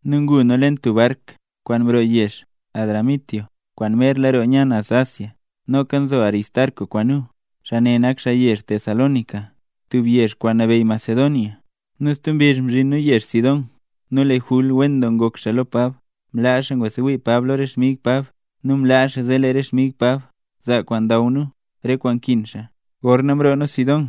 Nu ngu nu leen tub bark kwaan mroo yezh Adramitio kwaan merla roo nya naz Asia. Noka nzo Aristarco kwaan nu, xaa ne nak xaa yezh Tesalónica, tub yezh kwaan nabeyy Macedonia. Nu stub mbizh mzhin nu yezh Sidón, nu lee Jul wen doo ngok xaa lo Pab, nu mlaa xaa ngwasewii Pab lo re xmig Pab, nu mlaa xaa zee lee re xmig Pab zaa kwaan ndaw xaa nu re kwaan nkin xaa. Gorna mroo nu Sidón,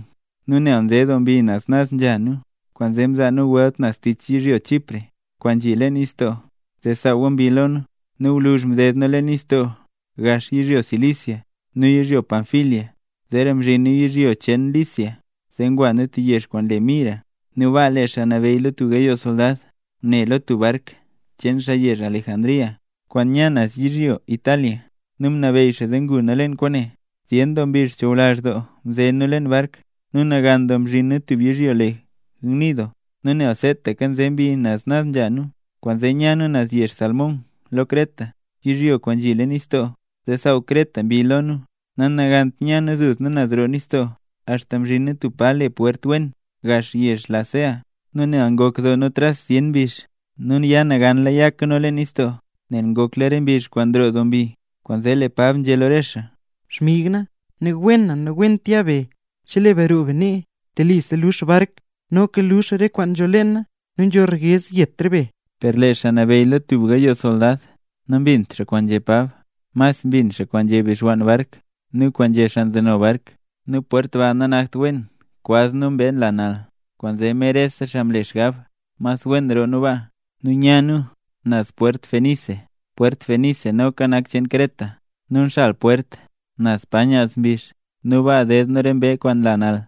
nu nel nze doo mbi naz nzha nu, kwaanzee mzaa nu welt naz tich yizhyo Chipre, kwaan nzhi leen nistoo, zee saawa mbi lo nu. Nu gwluzh mded nu leen nistoo gax yizhyo Cilicia nu yizhyo Panfilia, zeera mzhin nu yizhyo cheen Licia zee ngwa nu tub yezh kwaan le Mira. Nu baa lee xaa nabeyy lo tub gayoo soldad ngune lo tub bark cheen xaa yezh Alejandría, kwaan nya naz yizhyo Italia, nu mnabeyy xaa zee ngu nu leen kwaane. Zyen doo mbizh chuwlazh doo mze nu leen bark nu nagan doo mzhin nu tub yizhyo le Gnido. Nu nel seetaka nze mbi naz nzha nu, kwaanzee nya nu naz yezh Salmón lo Creta, yizhyo kwaan nzhi leen nistoo, zee saaw Creta mbi lo nu. Nanagant nya nu duzna naz roo nistoo, axta mzhin nu tub pa le Pwert Wen gax yezh Lasea. Nu nel ngok doo nu tras zyen mbizh nu ya naganla yaka nu leen nistoo, nel ngokla re mbizh kwaan nroo doo mbi, kwaanzee Pab nzhé lo re xaa: —Xmig na, ne wen na, nawent ya be; chelee be roo be nee, telisa lux bark, noka lux re kwaan nzho leen bark, nu nzho ryez yet re be. Per lee xaa nabeyy lo tub gayoo soldad, nambint xaa kwaan nzhé Pab, mas mbin xaa kwaan nzhé bixwann bark nu kwaan nzhé xaa nzeno bark. Nu pwert ba nanakt wen kwaz nu re mbee nla nal. Kwaanzee mer rese xaa mle xgab mas wen roo nu baa, nu nya nu naz Pwert Fenice. Pwert Fenice noka nak cheen Creta, nu nxal pwert naz pa nyaz mbizh. Nu baa ded nu re mbee kwaan nla nal.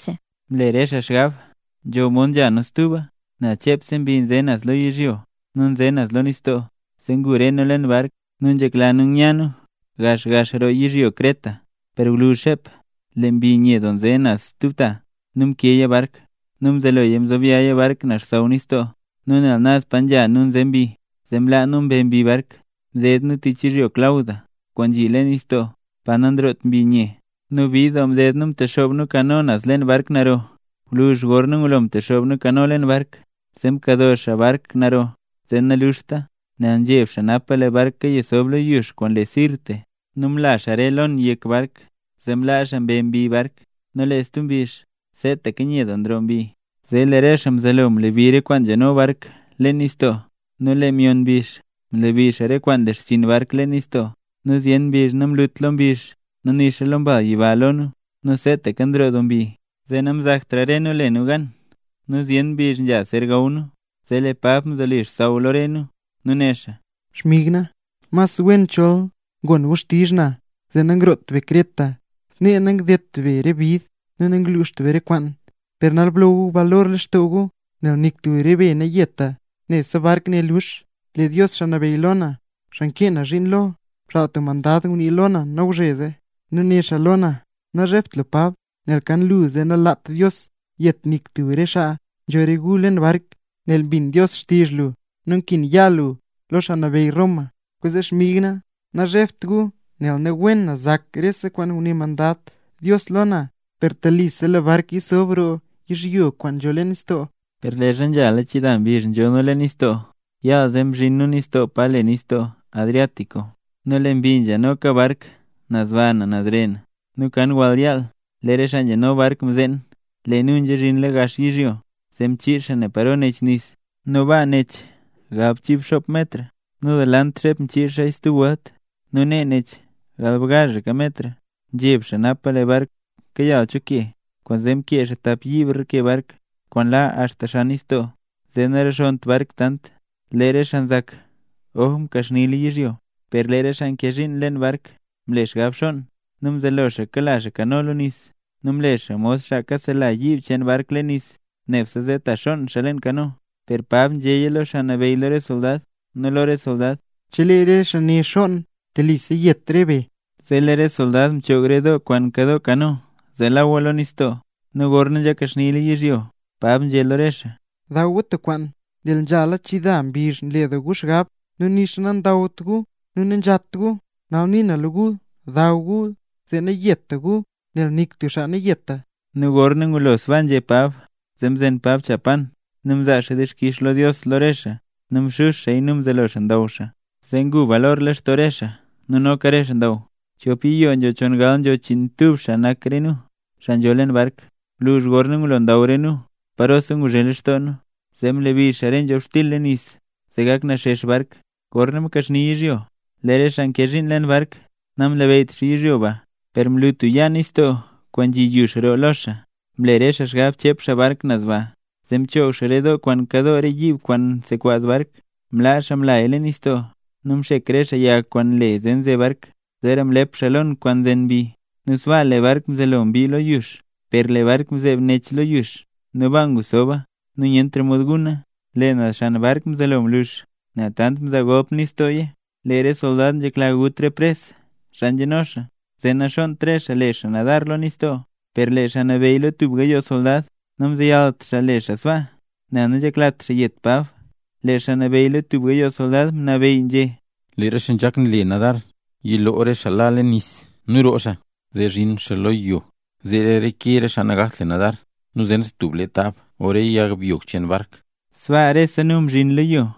Mle re xaa xgab nzho mod nzha nu stuba, nel chepse mbi nze naz lo yizhyo nu nze naz lo nistoo, zee ngu re nu leen bark, nu nzhekla nu nya nu gax gax roo yizhyo Creta. Per gwluzh xep lee mbi nye doo nze naz stub ta, nu mkeeya bark. Nu mzeloya mzobyaaya bark naz xsaww nistoo. Nu nel naz pa nzha nu nze mbi, zee mlaa nu mbe mbi bark. Mded nu tich yizhyo Clauda kwaan nzhi leen nistoo, pa nanroot mbi nye. Nu bid doo mded nu mtexoob nu kano naz leen bark naro. Gwluzh gorna ngulo mtexoob nu kano leen bark, zee mkado xaa bark naro zee naluxta, nel nzheb xaa napa lee bark kayasob lo yux kwaan le Sirte. Nu mla xaa re lon yek bark, zee mlaa xaa mbe mbi bark. Nu lee stub mbizh, seetaka nye doo nroo mbi, zee lee re xaa mzelo mlebi re kwaan nzhano bark leen nistoo. Nu lee myon mbizh, mlebi xaa re kwaan nle xchiin bark leen nistoo. Nu zyen mbizh namlut lo mbizh nixa lo mbal yiba lo nu, nu seetaka nroo doo mbi, zee namzaktra re nu le nu gan. Nu zyen mbizh nzha zer gaw nu, zee lee Pab mzoli xsaww lo re nu, nu né xaa: —Xmig na, mas wen chol ngon gu xtizh na, zee nangroot be Creta; snee nangdedt be re bid nu nangluxt be re kwaan. Per nal blo gu balor lextoo gu, nel nik tub re be nayeta, nebse bark ne lux. Lee Dios Xaa Nabeyy lo na, xaa nkee na zhiin lo mxaal tub xmandad ngunii lo na nawzheze, nu né xaa lo na: “Nazhebt lu Pab, nel kan lu, zee nalat Dios yet nik tub re xaa nzho re gu leen bark, nel mbin Dios xtizh lu nu nkin ya lu lo xaa nabeyy Roma”. Kwaanzee xmig na, nazhebt gu, nel ne wen na zak rese kwaan nguné xmandad Dios lo na. Per telisa lee bark yisob roo yizhyo kwaan nzho leen nistoo. Per leezha nzha chida mbizh nzho nu leen nistoo, yaal zee mzhin nu nistoo pa le Nistoo Adriático. Nu lee mbi nzhenoka bark naz baa nu naz ree. Nu kan wall yaal lee re xaa nzhano bark mzeen lee nu nzhazhin gax yizhyo. Zee mchiix xaa ne paro nech nis, nu baa nech galbchii xop metr. Nu delant xep mchiix xaa stub welt, nu nee nech galbgazhaka metr. Nzheb xaa napa lee bark kayal cho ke, kwaanzee mkee xaa tap yiib reke bark kwaan la axta xan nistoo zee naxonnt bark tant. Lee re xaa nzak: “Oj mkaxnila yizhyo”. Per lee re xaa nkee zhiin leen bark mle xgab xonn. Nu mzelo xaa kala xaa kano lo nis, nu mle xaa mod xaa kaselaka yiib cheen bark leen nis, nebse zee ta xonn xaa leen kano. Per Pab nzhéya lo xaa nabeyy lo re soldad nu lo re soldad: —Chelee re xaa ne xonn, telisa zet re be. Zee lee re soldad mchoog re doo kwaan nkadoo kano zee lawa lo nistoo. Nu gorna nzhakaxnila yizhyo, Pab nzhé lo re xaa: —Daw gu tub kwaan. Nel nzhala chida mbizh nle doo gu xgab zee nixa nandawt gu nu nanzhat gu. Nal nii na lo gu, daw gu zee nayeta gu, nel nik tub xaa nayeta. Nu gorna ngulo sbaa nzhé Pab, zee mzen Pab cha pan nu mzaa xaa dixkix lo Dios lo re xaa, nu mxux xaaya nu mzelo xaa ndaw xaa. Zee ngu balor lextoo rese xaa nu noka re xaa ndaw. Chop yiyoo nzho chongal nzho chiinmtub xaa nak re nu, xaa nzho leen bark. Gwluzh gorna ngulo ndaw re nu parosa nguzhe lextoo nu, zee mlebi xaa re nzhobxtil leen nis zee gak naxex bark. Gorna mkaxni yizhyo, lee re xaa nkee zhiin leen bark namlabeyyt xaa yizhyo ba, per mlu tub yaa nistoo kwaan nzhi yux roo lo xaa; mle re xaa xgab chep xaa bark naz baa. Zee mchoog xaa re doo kwaan nkadoo re yiib kwaan nsekwaz bark, mlaa xaa mlaya leen nistoo. Nu mxek re xaa yag kwaan nle nze bark. Zeera mlep xaa lon kwaan nzen mbi nu sbaa lee bark mzelo mbii lo yux. Per lee bark mzeeb neb lo yux nu baa ngusoba, nu nyentra mod guna. Lee naz xan bark mzelo mlux nel tant mzaa golp nistooya. Lee re soldad nzhekla gut re pres, xaa nzheno xaa, zee naxonnt re xaa le xaa nadar lo nistoo. Per lee xaa nabeyy lo tub gayoo soldad, namzeyalt xaa le xaa sbaa, nel nanzheklat xaa yet Pab. Lee xaa nabeyy tub gayoo soldad mnabeyy nzhé: —Lee re xaa nzhak nle nadar, yilo re xaa la leen nis nu roo xaa, zee zhin xaa lo yo. Zeera reke re xaa nagakt le nadar, nu zen xaa tub le tab o re yag byog cheen bark. Sbaa rese nu mzhin lo yo.